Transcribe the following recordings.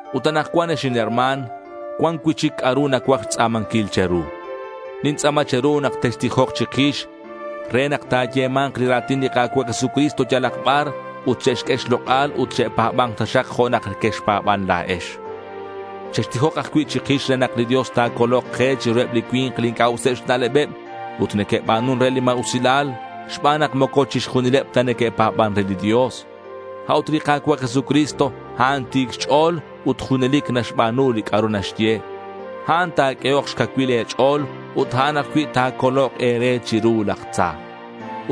Ut anakcuan ex inherma̱n, cuan cui'chic c'a'ru nacuaj xtz'a̱manquil che̱ru. Nintz'a̱ma che̱ru nak textijok chikix re nak ta̱yema̱nk li ra̱tin li Ka̱cua' Jesucristo yalak bar ut che'xq'ue xlok'al ut che'pa̱ba̱nk taxak jo' nak quexpa̱ban la̱ex. Chextijok ajcui' chikix re nak li Dios ta̱colok ke chiruheb li cui̱nk li inc'a' useb xna'lebeb ut neque'ba̱nun re li ma̱usilal xban nak moco chixjunileb ta neque'pa̱ban re li Dios. A'ut li Ka̱cua' Jesucristo, a'an ti̱c xch'o̱l ut junelic naxba̱nu li c'a'ru naxye. A'an ta̱q'uehok xcacuil e̱ch'o̱l ut a'an ajcui' ta̱colok e̱re chiru laj tza.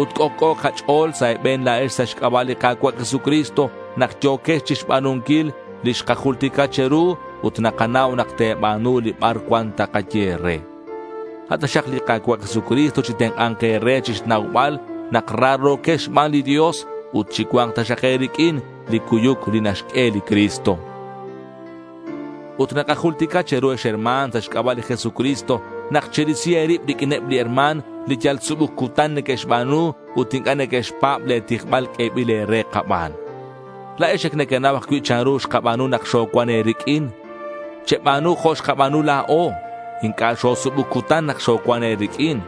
Ut c'ojc'o kach'o̱l sa' e̱be̱n la̱ex sa' xc'aba' li Ka̱cua' Jesucristo nak yo̱quex chixba̱nunquil li xkajultica che̱ru ut nakanau nak te̱ba̱nu li bar cuan takaye e̱re. A' taxak li Ka̱cua' Jesucristo chitenk'a̱nk e̱re chixnaubal nak raro̱quex xban li Dios ut chicua̱nk taxak e̱riq'uin li cuyuc li naxq'ue li Cristo. Ut nakajultica che̱ru ex herma̱n, sa' xc'aba' li Jesucristo nak cherisi e̱rib riq'uineb li herma̱n li yal subuc cutan neque'xba̱nu ut inc'a' neque'xpa̱b le̱ tijbal q'uebil e̱re kaban. La̱ex ac nequenau ajcui' chanru xkaba̱nu nak xocuan e̱riq'uin. Cheba̱nu jo' xkaba̱nu la̱o. Inc'a' xosubuc cutan nak xocuan e̱riq'uin.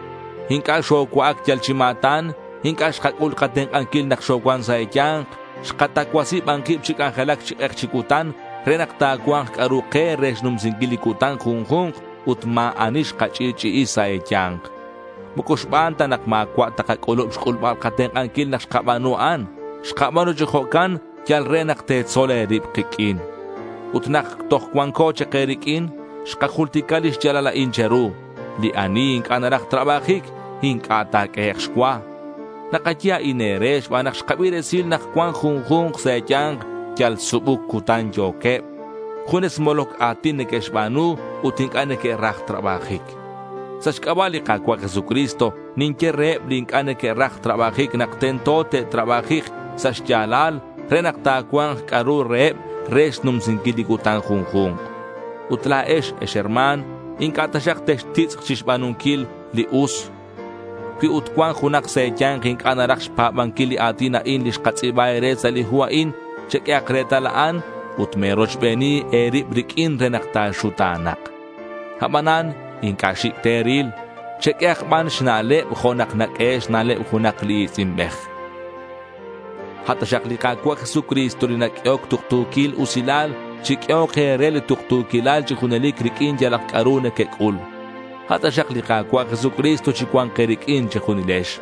Inc'a' xocua'ac yal chi ma̱tan. Inc'a' xkac'ul katenk'anquil nak xocuan sa' e̱ya̱nk. Xkatacuasi ban kib chi c'anjelac chi k'ek chi cutan re nak ta̱cua̱nk c'a'ru ke re xnumsinquil li cutan junju̱nk ut ma̱ ani xkach'i'ch'i'i sa' e̱ya̱nk. Moco xban ta nak ma̱cua' ta kac'ulub xc'ulbal katenk'anquil nak xkaba̱nu a'an. Xkaba̱nu chi jo'can yal re nak te̱tzol e̱rib kiq'uin. Ut nak toj cuanco chak e̱riq'uin, xkajultica li xya̱lal a'in che̱ru: li ani inc'a' naraj trabajic, inc'a' ta̱q'uehek' xcua. Nakaye a'in e̱re xban nak xkabi resil nak cuan junju̱nk sa' e̱ya̱nk yal subuc cutan yo̱queb. Junes moloc a̱tin neque'xba̱nu ut inc'a' neque'raj trabajic. Sa' xc'aba' li Ka̱cua' Jesucristo, ninye reheb li inc'a' neque'raj trabajic nak tento te'trabajik sa' xya̱lal re nak ta̱cua̱nk c'a'ru reheb re xnumsinquil li cutan junju̱nk. Ut la̱ex, ex herma̱n, inc'a' taxak textitz'k chixba̱nunquil li us. Cui ut cuan junak sa' e̱ya̱nk inc'a' naraj xpa̱banquil li a̱tin a'in li xkatz'i̱ba e̱re sa' li hu a'in, cheq'uehak retal a'an. Ut me̱rochbeni e̱rib riq'uin re nak ta̱xuta̱na̱k. Abanan inc'a' xi̱c' te̱ril. Cheq'uehak ban xna'leb jo' nak naq'uehe' xna'leb junak li i̱tz'inbej. A' taxak li Ka̱cua' Jesucristo li naq'uehoc tuktu̱quil usilal, chiq'uehok e̱re li tuktu̱quilal chi junelic riq'uin yalak c'a'ru nequec'ul. A' taxak li Ka̱cua' Jesucristo chicua̱nk e̱riq'uin che̱junilex.